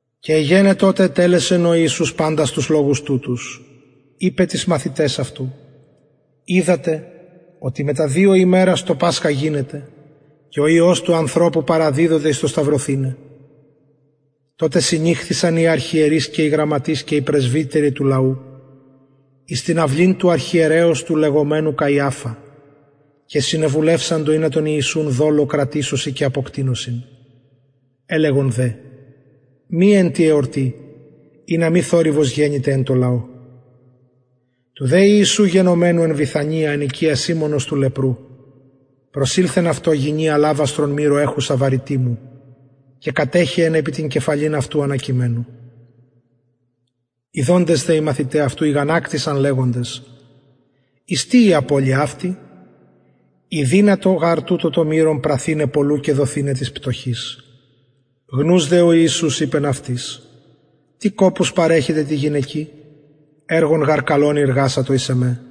και εγενετο οτε ετελεσεν ο ιησους παντας τους λογους τουτους ειπεν τοις μαθηταις αυτου οιδατε οτι μετα δυο ημερας το πασχα γινεται και ο υιος του ανθρωπου παραδιδοται εις το σταυρωθηναι τοτε συνηχθησαν οι αρχιερεις και οι γραμματεις και οι πρεσβυτεροι του λαου εις την αυλην του αρχιερεως του λεγομενου καιαφα και συνεβουλευσαντο ινα τον ιησουν δολω κρατησωσιν και αποκτεινωσιν ελεγον δε μη εν τη εορτη ινα μη θορυβος γενηται εν τω λαω του δε ιησου γενομενου εν βηθανια εν οικια σιμωνος του λεπρου προσηλθεν αυτω γυνη αλαβαστρον μυρου εχουσα βαρυτιμου και κατεχεεν επι την κεφαλην αυτου ανακειμενου ιδοντες δε οι μαθηται αυτου ηγανακτησαν λεγοντες εις τι η απωλεια αυτη ηδυνατο γαρ τουτο το μυρον πραθηναι πολλου και δοθηναι πτωχοις γνους δε ο ιησους ειπεν αυτοις τι κοπους παρεχετε τη γυναικι εργον γαρ καλον ειργασατο εις εμε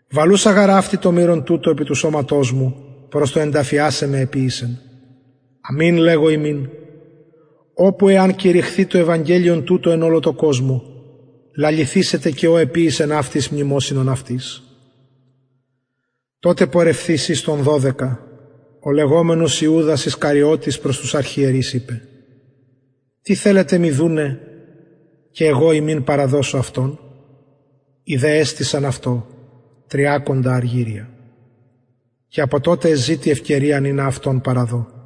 βαλουσα γαρ αυτη το μυρον τουτο επι του σωματος μου προς το ενταφιασαι με εποιησεν αμην λεγω υμιν οπου εαν κηρυχθη το ευαγγελιον τουτο εν ολω τω κοσμω λαληθησεται και ο εποιησεν αυτη εις μνημοσυνον αυτης τοτε πορευθεις εις των δωδεκα ο λεγομενος ιουδας ισκαριωτης προς τους αρχιερεις ειπεν τι θελετε μοι δουναι καγω υμιν παραδωσω αυτον οι δε εστησαν αυτω τριακοντα αργυρια και απο τοτε εζητει ευκαιριαν ινα αυτον παραδω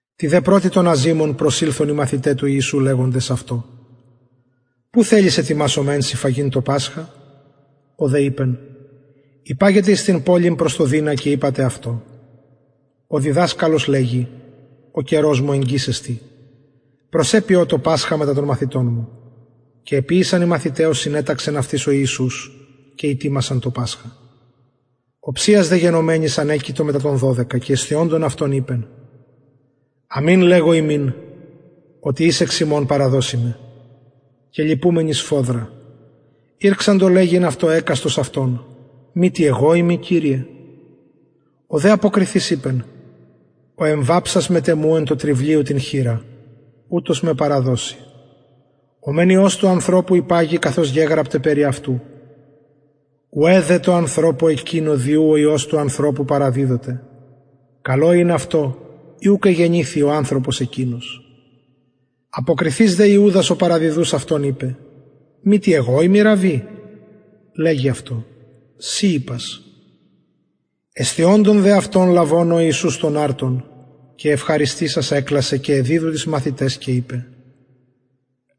τη δε πρωτη των αζυμων προσηλθον οι μαθηται τω ιησου λεγοντες αυτω που θελεις ετοιμασομεν σοι φαγειν το πασχα ο δε ειπεν υπαγετε εις την πολιν προς τον δεινα και ειπατε αυτω ο διδασκαλος λεγει ο καιρος μου εγγυς εστιν προς σε ποιω το πασχα μετα των μαθητων μου και εποιησαν οι μαθηται ως συνεταξεν αυτοις ο ιησους και ητοιμασαν το πασχα οψιας δε γενομενης ανεκειτο μετα των δωδεκα και εσθιοντων αυτων ειπεν αμην λεγω υμιν οτι εις εξ υμων παραδωσει με και λυπουμενοι σφοδρα ηρξαντο λεγειν αυτω εκαστος αυτων μητι εγω ειμι κυριε ο δε αποκριθεις ειπεν ο εμβαψας μετ εμου εν τω τρυβλιω την χειρα ουτος με παραδωσει ο μεν υιος του ανθρωπου υπαγει καθως γεγραπται περι αυτου ουαι δε τω ανθρωπω εκεινω δι ου ο υιος του ανθρωπου παραδιδοται καλον ην αυτω ει ουκ εγεννηθη ο ανθρωπος εκεινος αποκριθεις δε ιουδας ο παραδιδους αυτον ειπεν μητι εγω ειμι ραββι λεγει αυτω συ ειπας εσθιοντων δε αυτων λαβων ο ιησους τον αρτον και ευχαριστησας εκλασεν και εδιδου τοις μαθηταις και ειπεν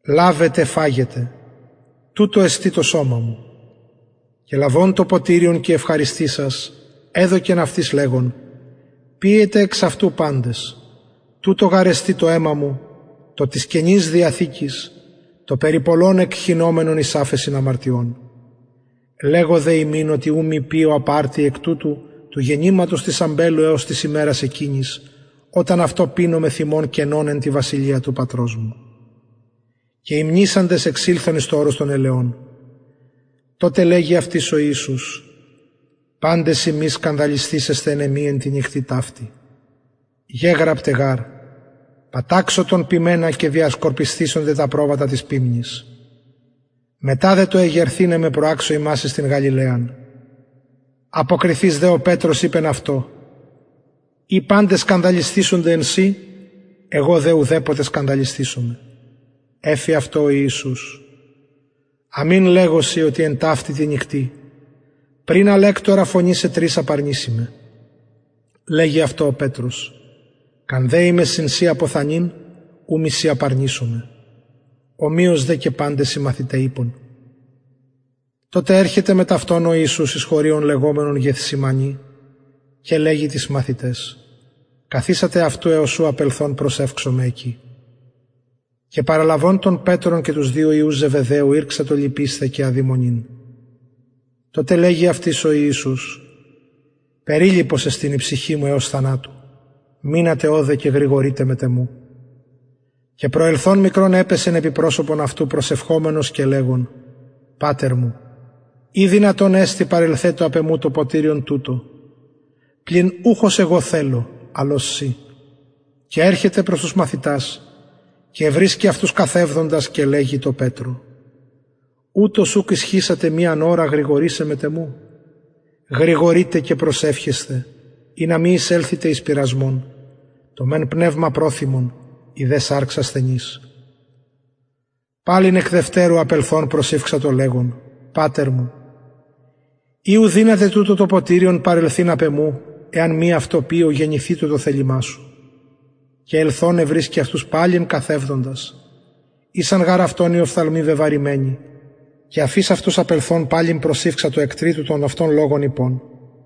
λαβετε φαγετε τουτο εστιν το σωμα μου και λαβων το ποτηριον και ευχαριστησας εδωκεν αυτοις λεγων πιετε εξ αυτου παντες τουτο γαρ εστιν το αιμα μου το της καινης διαθηκης το περι πολλων εκχυνομενον εις αφεσιν αμαρτιων λεγω δε υμιν οτι ου μη πιω απ αρτι εκ τουτου του γεννηματος της αμπελου εως της ημερας εκεινης οταν αυτο πινω μεθ υμων καινον εν τη βασιλεια του πατρος μου και υμνησαντες εξηλθον εις το ορος των ελαιων τοτε λεγει αυτοις ο ιησους παντες υμεις σκανδαλισθησεσθε εν εμοι εν τη νυκτι ταυτη γεγραπται γαρ παταξω τον ποιμενα και διασκορπισθησεται τα προβατα της ποιμνης μετα δε το εγερθηναι με προαξω υμας εις την γαλιλαιαν αποκριθεις δε ο πετρος ειπεν αυτω ει παντες σκανδαλισθησονται εν σοι εγω δε ουδεποτε σκανδαλισθησομαι εφη αυτω ο ιησους αμην λεγω σοι οτι εν ταυτη τη νυκτι πριν αλεκτορα φωνησαι τρις απαρνηση με λεγει αυτω ο πετρος καν δεη με συν σοι αποθανειν ου μη σε απαρνησωμαι ομοιως δε και παντες οι μαθηται ειπον τοτε ερχεται μετ αυτων ο ιησους εις χωριον λεγομενον γεθσημανη και λεγει τοις μαθηταις καθισατε αυτου εως ου απελθων προσευξωμαι εκει και παραλαβων τον πετρον και τους δυο υιους ζεβεδαιου ηρξατο λυπεισθαι και αδημονειν τοτε λεγει αυτοις ο ιησους περιλυπος εστιν η ψυχη μου εως θανατου μεινατε ωδε και γρηγορειτε μετ εμου και προσελθων μικρον επεσεν επι προσωπον αυτου προσευχομενος και λεγων πατερ μου ει δυνατον εστιν παρελθετω απ εμου το ποτηριον τουτο πλην ουχ ως εγω θελω αλλ ως συ και ερχεται προς τους μαθητας και ευρισκει αυτους καθευδοντας και λεγει τω πετρω ουτως ουκ ισχυσατε μιαν ωραν γρηγορησαι μετ εμου γρηγορειτε και προσευχεσθε ινα μη εισελθητε εις πειρασμον το μεν πνευμα προθυμον η δε σαρξ ασθενης παλιν εκ δευτερου απελθων προσηυξατο λεγων πατερ μου ει ου δυναται τουτο το ποτηριον παρελθειν απ εμου εαν μη αυτο πιω γενηθητω το θελημα σου και ελθων ευρισκει αυτους παλιν καθευδοντας ησαν γαρ αυτων οι οφθαλμοι βεβαρημενοι και αφεις αυτους απελθων παλιν προσηυξατο εκ τριτου τον αυτον λογον ειπων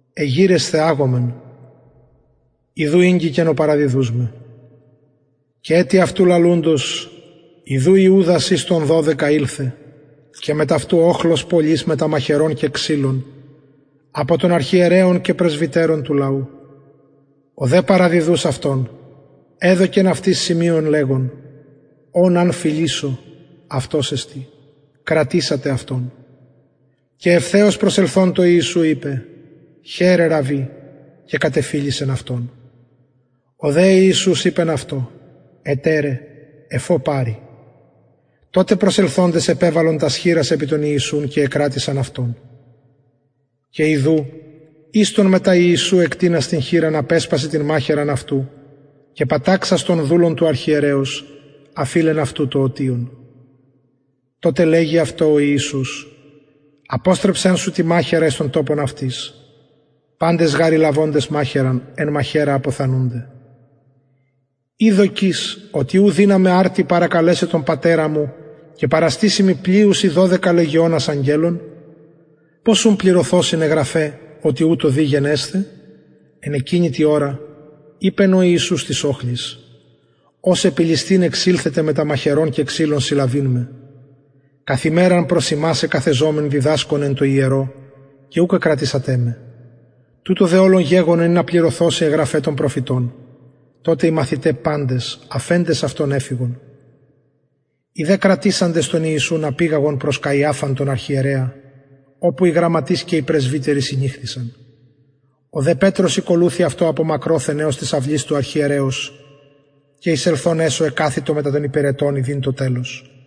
εγειρεσθε αγωμεν ιδου ηγγικεν ο παραδιδους με και ετι αυτου λαλουντος ιδου ιουδας εις των δωδεκα ηλθεν και μετ αυτου οχλος πολυς μετα μαχαιρων και ξυλων απο των αρχιερεων και πρεσβυτερων του λαου ο δε παραδιδους αυτον εδωκεν αυτοις σημειον λεγων ον αν φιλησω αυτος εστιν κρατησατε αυτον και ευθεως προσελθων τω ιησου ειπεν χαιρε ραββι και κατεφιλησεν αυτον ο δε ιησους ειπεν αυτω εταιρε εφ ω παρει τοτε προσελθοντες επεβαλον τας χειρας επι τον ιησουν και εκρατησαν αυτον και ιδου εις των μετα ιησου εκτεινας την χειρα απεσπασεν την μαχαιραν αυτου και παταξας τον δουλον του αρχιερεως αφειλεν αυτου το ωτιον τοτε λεγει αυτω ο ιησους αποστρεψον σου την μαχαιραν εις τον τοπον αυτης παντες γαρ οι λαβοντες μαχαιραν εν μαχαιρα αποθανουνται η δοκεις οτι ου δυναμαι αρτι παρακαλεσαι τον πατερα μου και παραστησει μοι πλειους η δωδεκα λεγεωνας αγγελων πως ουν πληρωθωσιν αι γραφαι οτι ουτως δει γενεσθαι εν εκεινη τη ωρα ειπεν ο ιησους τοις οχλοις ως επι ληστην εξηλθετε μετα μαχαιρων και ξυλων συλλαβειν με καθ ημεραν προς υμας εκαθεζομην διδασκων εν τω ιερω και ουκ εκρατησατε με τουτο δε ολον γεγονεν ινα πληρωθωσιν αι γραφαι των προφητων τοτε οι μαθηται παντες αφεντες αυτον εφυγον οι δε κρατησαντες τον ιησουν απηγαγον προς καιαφαν τον αρχιερεα οπου οι γραμματεις και οι πρεσβυτεροι συνηχθησαν ο δε πετρος ηκολουθει αυτω απο μακροθεν εως της αυλης του αρχιερεως και εισελθων εσω εκαθητο μετα των υπηρετων ιδειν το τελος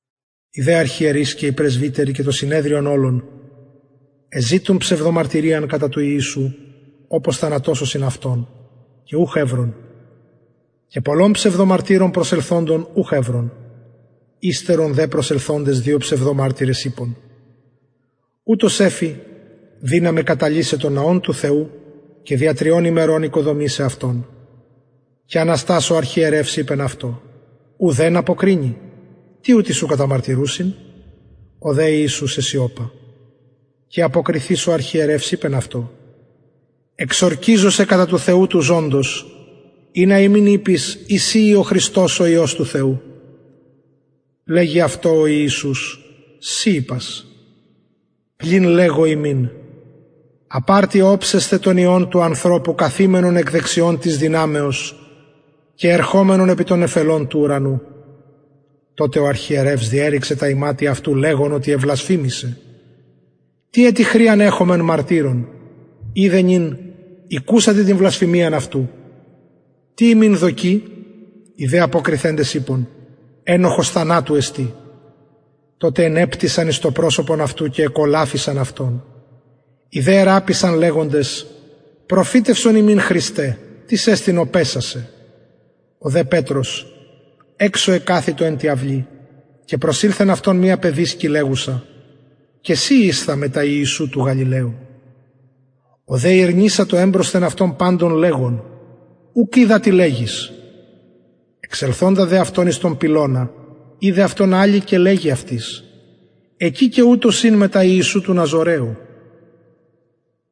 οι δε αρχιερεις και οι πρεσβυτεροι και το συνεδριον ολον εζητουν ψευδομαρτυριαν κατα του ιησου οπως θανατωσωσιν αυτον και ουχ ευρον και πολλων ψευδομαρτυρων προσελθοντων ουχ ευρον υστερον δε προσελθοντες δυο ψευδομαρτυρες ειπον ουτος εφη δυναμαι καταλυσαι τον ναον του θεου και δια τριων ημερων οικοδομησαι αυτον και αναστας ο αρχιερευς ειπεν αυτω ουδεν αποκρινη τι ουτοι σου καταμαρτυρουσιν ο δε ιησους εσιωπα και αποκριθεις ο αρχιερευς ειπεν αυτω εξορκιζω σε κατα του θεου του ζωντος ινα ημιν ειπης ει συ ει ο χριστος ο υιος του θεου λεγει αυτω ο ιησους συ ειπας πλην λεγω υμιν απ αρτι οψεσθε τον υιον του ανθρωπου καθημενον εκ δεξιων της δυναμεως και ερχομενον επι των νεφελων του ουρανου τοτε ο αρχιερευς διερρηξεν τα ιματια αυτου λεγων οτι εβλασφημησεν τι ετι χρειαν εχομεν μαρτυρων ιδε νυν ηκουσατε την βλασφημιαν αυτου τι υμιν δοκει οι δε αποκριθεντες ειπον ενοχος θανατου εστιν τοτε ενεπτυσαν εις το προσωπον αυτου και εκολαφισαν αυτον οι δε ερραπισαν λεγοντες προφητευσον ημιν χριστε τις εστιν ο παισας σε ο δε πετρος εξω εκαθητο εν τη αυλη και προσηλθεν αυτω μια παιδισκη λεγουσα και συ ησθα μετα ιησου του γαλιλαιου ο δε ηρνησατο εμπροσθεν αυτων παντων λεγων ουκ οιδα τι λεγεις εξελθοντα δε αυτον εις τον πυλωνα ειδεν αυτον αλλη και λεγει αυτοις εκει και ουτος ην μετα ιησου του ναζωραιου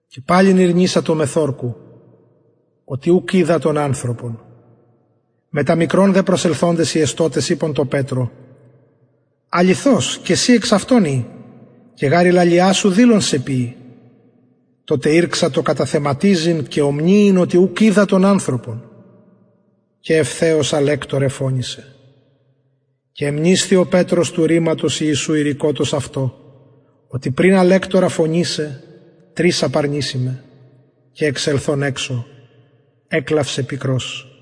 και παλιν ηρνησατο μεθ ορκου οτι ουκ οιδα τον ανθρωπον μετα μικρον δε προσελθοντες οι εστωτες ειπον τω πετρω αληθως και συ εξ αυτων ει και γαρ η λαλια σου δηλον σε ποιει τοτε ηρξατο καταθεματιζειν και ομνυειν οτι ουκ οιδα τον ανθρωπον και ευθεως αλεκτωρ εφωνησεν και εμνησθη ο πετρος του ρηματος του ιησου ειρηκοτος αυτω οτι πριν αλεκτορα φωνησαι τρις απαρνηση με και εξελθων εξω εκλαυσεν πικρως